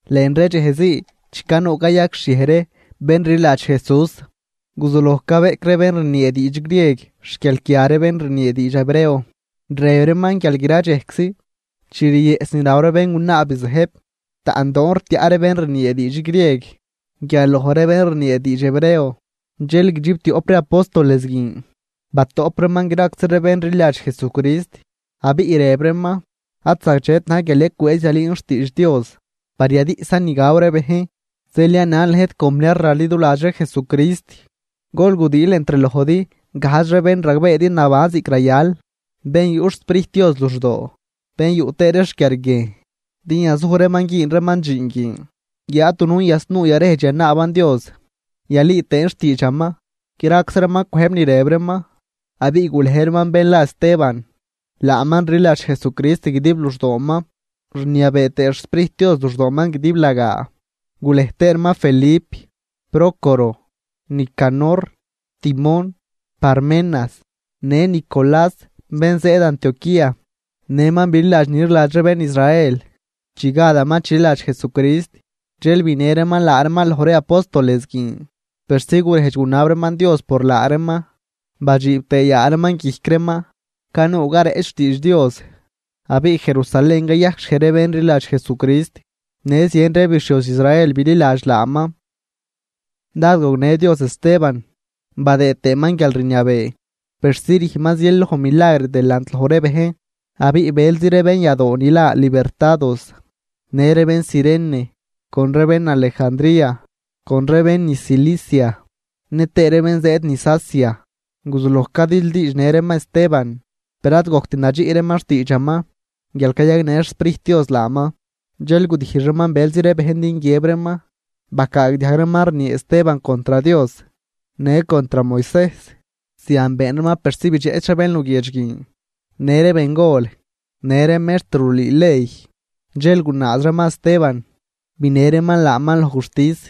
Lën ree dxej zii chi canuu cayajcxhiej ree bén rliladx Jesús, guzuloj cabeꞌc ree bén rniee diidx grieg xguialquia ree bén rniee diidx hebreo, rëb reeman guial gra dxejczi chi riëꞌs ni raw ree béngunaa bizëjb, taꞌndoon rtiaꞌ ree bén rniee diidx grieg guial loj ree bén rniee diidx hebreo. Dxel guidxibtioꞌp ree apóstoles guin batoꞌp reeman graczi ree bén rliladx Jesucrist, abiꞌ rëb reeman: ―Ad zagdxet na̱j guial yacwëëz yalüün xtiidx Dios par yadiꞌsan ni gaw ree bejn. Zeel yanan lëjt compniar raliduladx ree Jesucrist, gol gudiil entr lojdi gajdx ree bén ragbeedi naban ziꞌc rayal, bén yuꞌ xSprijt Dios luxdoo, bén yuꞌ tëë ree xquiarguiejn, din yazuj reeman güün reeman dxiin guin. Guiáad dunujn yasnuu yarejdx yanaaban Dios, yalüü tëën xtiidxaman. Graczi reeman cwëjb ni rëb reeman, abiꞌ gulej reeman bén la Esteban, laaman rliladx Jesucrist guidib luxdooman, rniabee tëë xSprijt Dios luxdooman guidiblagaa. Gulej tëë reeman Felip, Prócoro, Nicanor, Timón, Parmenas në Nicolás bén zëëd Antioquía, nëman bililadx ni rliladx ree bén Israel chi gadaman chililadx Jesucrist. Dxel binë reeman laa reeman loj ree apóstoles guin, persi gurejdx gunab reeman Dios por laa reeman badxiib tëë yaa reeman guijc reeman. Canuu careꞌch xtiidx Dios, abiꞌ Jerusalén cayajcxhiej ree bén rliladx Jesucrist, në zien ree bixhioz Israel bililadx laaman. Dád gognë Dios Esteban badëë tëëman guialrniabee persi rüjnman zien loj milagr delant loj ree bejn. Abiꞌ bëlzi ree bén yadoo ni la Libertados në ree bén Cirene con ree bén Alejandría con ree bén niz Cilicia nëtëë ree bén zëëd niz Asia, guzuloj cadildiidxnë reeman Esteban, per ad gojct nadxiꞌ reeman xtiidxaman guial cayagnë xSprijt Dios laaman. Dxel gudijx reeman bëlzi ree bejn din guiëb reeman, bacaagdiajg reeman rniee Esteban contr Dios në contr Moisejs. Zian been reeman persi bidxeꞌch ree bén luguiedx guin, në ree bengol në ree mextr rulüü ley. Dxel gunaaz reeman Esteban, binë reeman laaman loj guxtis.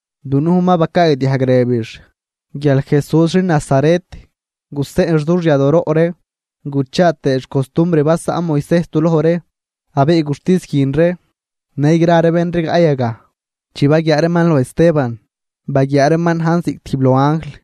Dunujn ma bacaagdiajg rëbix guial Jesús xin Nazaret guseꞌnx dux yadooroꞌ ree, guchaa tëëx costumbr basaꞌn Moisejs du loj ree. Abiꞌ guxtis guin ree në gra ree bén rigaꞌ yagaj, chi baguiaa reeman loj Esteban, baguiaa reeman najn ziꞌc tijb loj anjl.